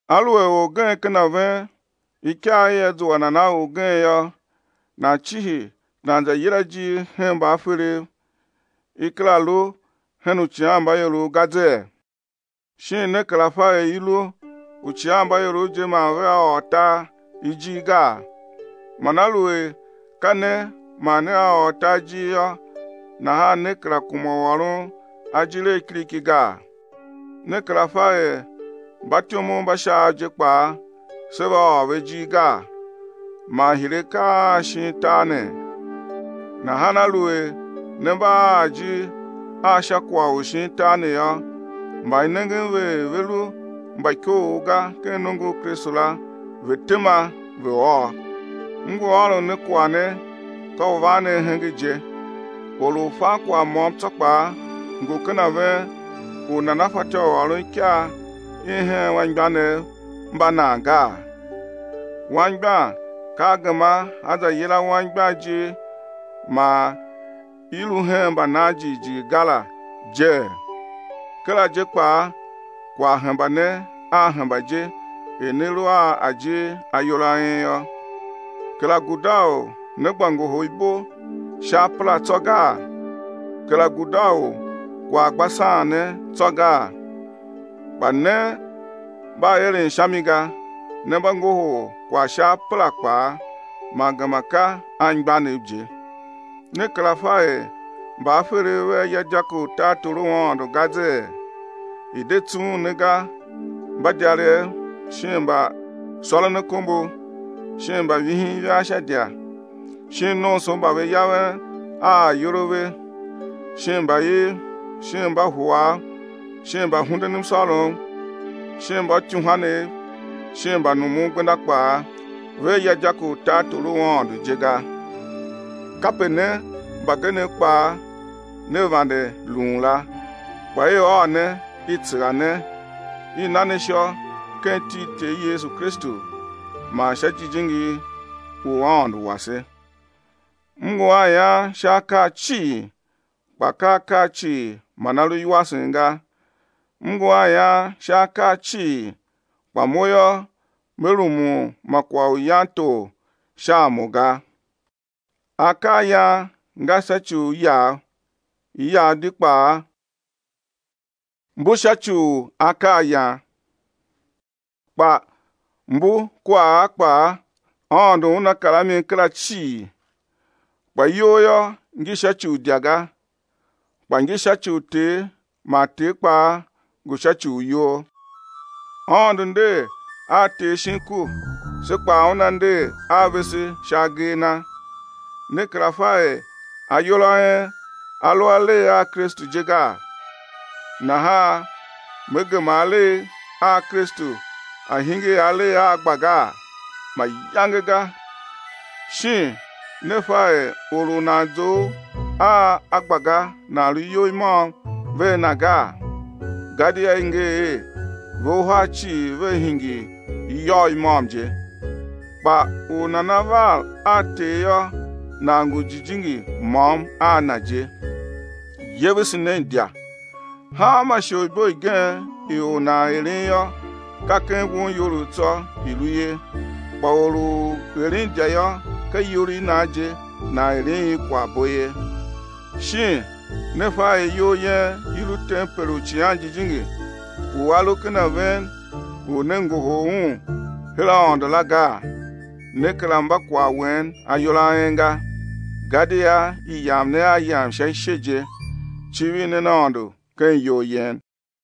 Aluer orgen ken a ven ikyaa ia zua nan a orgen yô, nan cihi nan yila ijir hen mbaaferev, i kera lu hen uicighanmbaiorov ga zee? Shin ne kera fa er i lu uicighanmbaiorov je man vea ôr tar ijir gaa? Man aluer ka ne man nea ôr tar ijir yô, nahan ne kera kuma u ôron ajir a kiriki gaa? Ne kera fa er mbatyomov mba Shaav je kpaa sé va ôr ve ijir gaa? Man hire akaa a shin tar ne? Nahan aluer ne mba a ajir a sha kwagh u shin tar ne yô, mba i nengen ve er ve lu mba ikoogh ga ken nongo u Kristu la, ve̱ tema ve̱ ôr. M ngu ôron ne kwagh ne, ka u van ne ahenge je. Or u fan kwagh môm tsô kpaa ngu ken a ven u nana fatyô u ôron ikyaa i hen anmgbianev mba nan gaa? Angbian ka a gema a za yila anmgbian ijir man i lu hen mbanan jighjigh ga la jee? Kera je kpaa kwagh hemba ne a hemba je er ne lu a ajir ayol a en yô. Kera guda u ne gba ngohol ibo sha apera tsô gaa? Kera guda u kwagh a gba saan ne tsô gaa? Kpa ne mba eren sha mi ga, ne mba ngohol kwagh sha apera kpaa, man gema ka anmgbianev je. Ne kera fa er mbaaferev vea ya dyako u tartor u Aôndo ga jee? I̱ de tsughun ne ga, mbadyarev shin mbasôronakombo shin mbavihin ivaa sha idya shin nomso mba ve yaven a ayol a ve shin mbaiv shin mbahuav shin mbahundenmsôrom shin mbauityuhwanev shin mbanumungbenda kpaa, vea ya dyako u tartor u Aôndo je ga. Kape ne mbagenev kpaa ne vande lun la. Kpa i ôô ne, i tsegha ne, i na ne ishô ken iti i Ter Yesu Kristu man sha Jijingi u Aôndo wase. M ngu a ian sha akaa cii, kpa ka akaa cii man a lu iwasen ga, m ngu a ian sha akaa cii, kpa mo yô, me rumun ma kwagh u yan tor sha a mo ga. Akaayan nga sha ci u iyav; iyav di kpaa mbu sha ci u akaayan, kpa mbu kua a kpaa, Aôndo Una kar a mi kera cii. Kpa iyol yô, ngi sha ci u idya ga, kpa ngi sha ci u Ter man Ter kpaa ngu sha ci u iyol. Aôndo nder a Ter shin ku, se kpaa Una nder a vese sha agee a Na. Ne kera fa er ayol a en a lu alegh a Kristu je gaa? Nahan me gema alegh a Kristu a̱ hingir alegh a agbagaa? Mayange ga. Shin ne fa er or u nan zough a agbaga nan lu iyol i môm vea na gaa? Gadia i nger er: Ve uhar cii vea hingir iyôgh i môm je. Kpa u nana var a Ter yô, nan ngu jijingi môm a Na je. Yevese nen idya. Hanma isholibo igen i or nan eren yô, ka ken wonyolough tsô i lu ye. Kpa or u eren idya yô, ka iyol i nan je nan eren i kwaghbo ye. Shin ne fa er iyol yen i lu tempel u Icighan Jijingi u A lu ken a ven u ne ngohol Un her Aôndo la gaa? Ne kera mba kwagh wen ayol a en ga. Gadia i yam ne a yam sha ishe je. Civir nen Aôndo ken iyol yen.